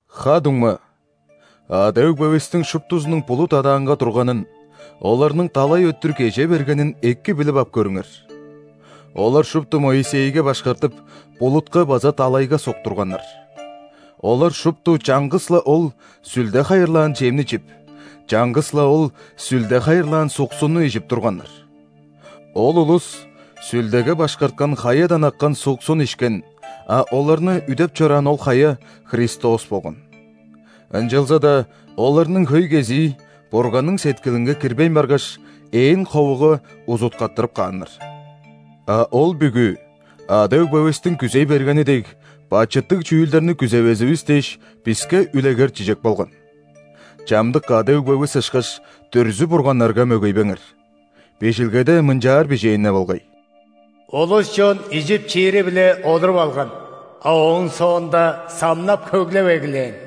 Ха-дуңма, ада-өгбевистиң шуптузунуң булут адаанга турганын, оларның далай өттүр кеже бергенин эки билип ап көрүңер. Олар шупту Моисейге башкартып, булутка база далайга суктурганнар. Олар шупту чаңгыс-ла ол, Сүлде хайырлаан чемни чип, чаңгыс-ла ол, Сүлде хайырлаан суксунну ижип турганнар. Ол улус Сүлдеге башкарткан Хаядан аккан суксун ишкен, а оларны үдеп чораан ол Хая – Христос болган. Ынчалза-даа оларның хөй кезии Бурганның сеткилинге кирбейн баргаш, ээн ховуга узуткаттырып кааннар. А ол бүгү, ада-өгбевистиң күзей бергени дег, бачыттыг чүүлдерни күзевезивис дээш, биске үлегер-чижек болган. Чамдык ада-өгбевис ышкаш, дүрзү-бурганнарга мөгейбеңер. Бижилгеде мынчаар бижээн-не болгай: «Улус-чон ижип-чиири-биле олуруп алган, а ооң соонда самнап-хөглеп эгелээн».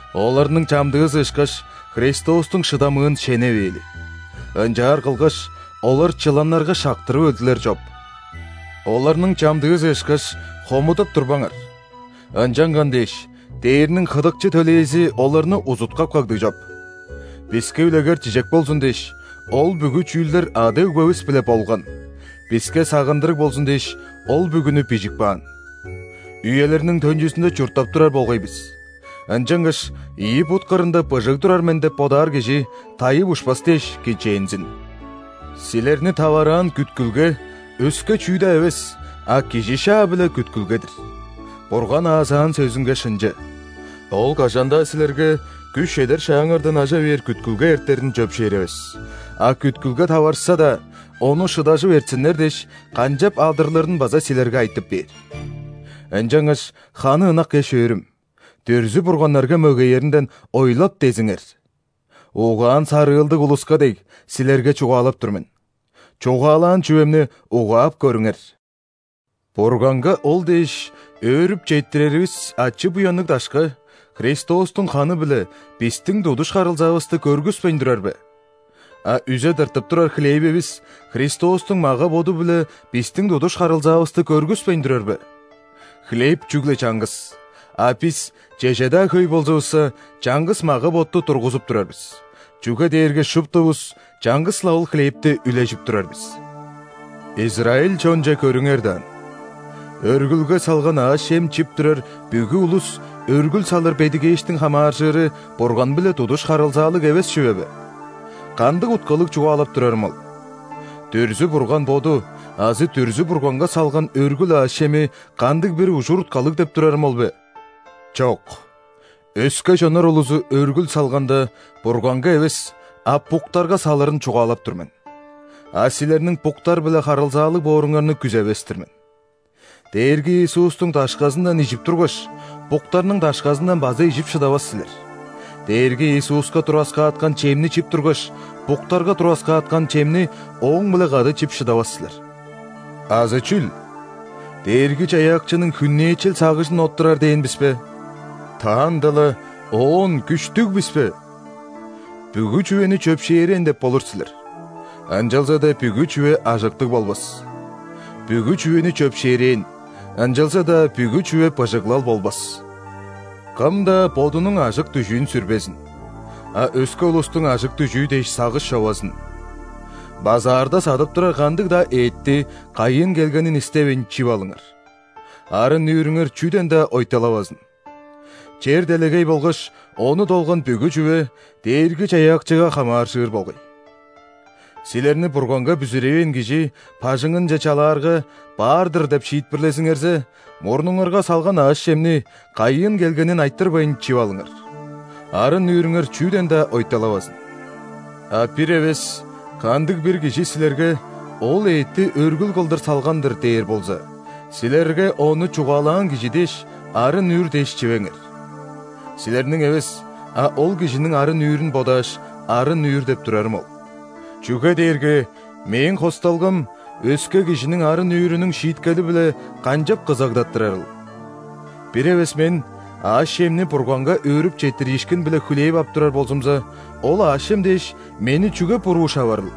Оларның чамдыызы ышкаш, Христостуң шыдамыын шеневээли. Ынчаар кылгаш, олар чыланнарга шактырып өлдүлер чоп. Оларның чамдыызы ышкаш, хомудап турбаңар. Ынчанган дээш, дээрниң хыдыкчы төлээзи оларны узуткап кагды чоп. Биске үлегер-чижек болзун дээш, ол бүгү чүүлдер ада-өгбевис-биле болган, биске сагындырыг болзун дээш, ол бүгүнү бижип каан. Үелерниң төнчүзүнде чурттап турар болгай бис. Ынчангаш ийи бут кырында быжыг турар мен деп бодаар кижи, тайып ушпас дээш, кичээнзин. Силерни тавараан күткүлге – өске чүү-даа эвес, а кижи шаа-биле күткүлге-дир. Бурган аазаан сөзүнге шынчы. Ол кажан-даа силерге күш чедер шааңардан ажа бээр күткүлге эртерин чөпшээревес, а күткүлге таварышса-даа, ону шыдажып эртсиннер дээш, канчап адырлырын база силерге айтып бээр. Ынчангаш, ханы ынак эш-өөрүм, дүрзү-бурганнарга мөгееринден ойлап-дезиңер! Угаан-сарыылдыг улуска дег, силерге чугаалап тур мен. Чугаалаан чүвемни угаап көрүңер. Бурганга ол дээш өөрүп четтиреривис ачы-буянныг дашка Христостуң ханы-биле бистиң тудуш харылзаавысты көргүспейн турар бе? А үзе тыртып турар хлевивис Христостуң мага-боду-биле бистиң тудуш харылзаавысты көргүспейн турар бе? Хлеб чүгле чаңгыс, а бис, чеже-даа хөй болзувусса, чаңгыс мага-ботту тургузуп турар бис, чүге дээрге шуптувус чаңгыс-ла ол хлебти үлежип турар бис. Израиль чонче көрүңер даан: өргүлге салган аъш-чем чип турар бүгү улус өргүл салыр бедигээштиң хамааржыры Бурган-биле тудуш харылзаалыг эвес чүве бе? Кандыг уткалыг чугаалап турарым ол? Дүрзү-бурган боду азы дүрзү-бурганга салган өргүл аъш-чеми кандыг-бир ужур-уткалыг деп турарым ол бе? Чок! Өске чоннар улузу өргүл салганда, Бурганга эвес, а буктарга салырын чугаалап тур мен. А силерниң буктар-биле харылзаалыг бооруңарны күзевес-тир мен. Дээрги Иисустуң дашказындан ижип тургаш, буктарның дашказындан база ижип шыдавас силер; Дээрги Иисуска тураскааткан чемни чип тургаш, буктарга тураскааткан чемни ооң-биле кады чип шыдавас силер. Азы чүл? Дээрги-Чаяакчының хүннээчел сагыжын оттурар дээн бис бе? Таанда-ла Оон күштүг бис бе? «Бүгү чүвени чөпшээрээн» деп болур силер, ынчалза-даа бүгү чүве ажыктыг болбас. «Бүгү чүвени чөпшээрээн», ынчалза-даа бүгү чүве быжыглал болбас. Кым-даа бодунуң ажык-дүжүүн сүрбезин, а өске улустуң ажык-дүжүү дээш сагыш човазын. Базаарда садып турар кандыг-даа эътти, кайыын келгенин истевейн, чип алыңар. Арын-нүүрүңер чүден-даа ойталавазын. Чер-делегей болгаш ону долган бүгү чүве Дээрги-Чаяакчыга хамааржыр болгай. Силерни Бурганга бүзүревээн кижи бажыңынче чалаарга, «баар-дыр» деп шиитпирлезиңерзе, мурнуңарга салган аъш-чемни, кайыын келгенин айтырбайн, чип алыңар. Арын-нүүрүңер чүден-даа ойталавазын. А бир эвес кандыг-бир кижи силерге: «Ол эътти өргүл кылдыр салган-дыр» – дээр болза, силерге ону чугаалаан кижи дээш, арын-нүүр дээш, чивеңер. Силерниң эвес, а ол кижиниң арын-нүүрүн бодааш, «арын-нүүр» деп турарым ол. Чүге дээрге мээң хосталгам өске кижиниң арын-нүүрүнүң шииткели-биле канчап кызагдаттырарыл? Бир эвес мен аъш-чемни Бурганга өөрүп четтириишкин-биле хүлээп ап турар болзумза, ол аъш-чем дээш, мени чүге буруу шаварыл?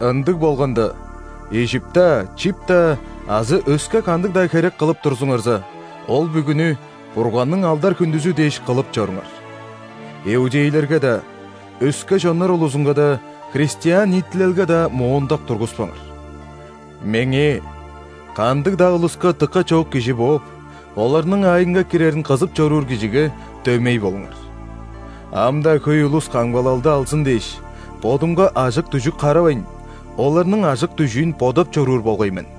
Ындыг болганда, ижип-даа, чип-даа азы өске кандыг-даа херек кылып турзуңарза, ол бүгүнү Бурганның алдар-хүндүзү дээш кылып чоруңар. Иудейлерге-даа, өске чоннар улузунга-даа, христиан ниитилелге-даа моондак тургуспаңар. Меңээ – кандыг-даа улуска дыка чоок кижи бооп, оларның аайынга кирерин кызып чоруур кижиге – дөмей болуңар. Ам-даа хөй улус камгалалды алзын дээш, бодумга ажык-дүжүк харавайн, оларның ажык-дүжүүн бодап чоруур болгай мен.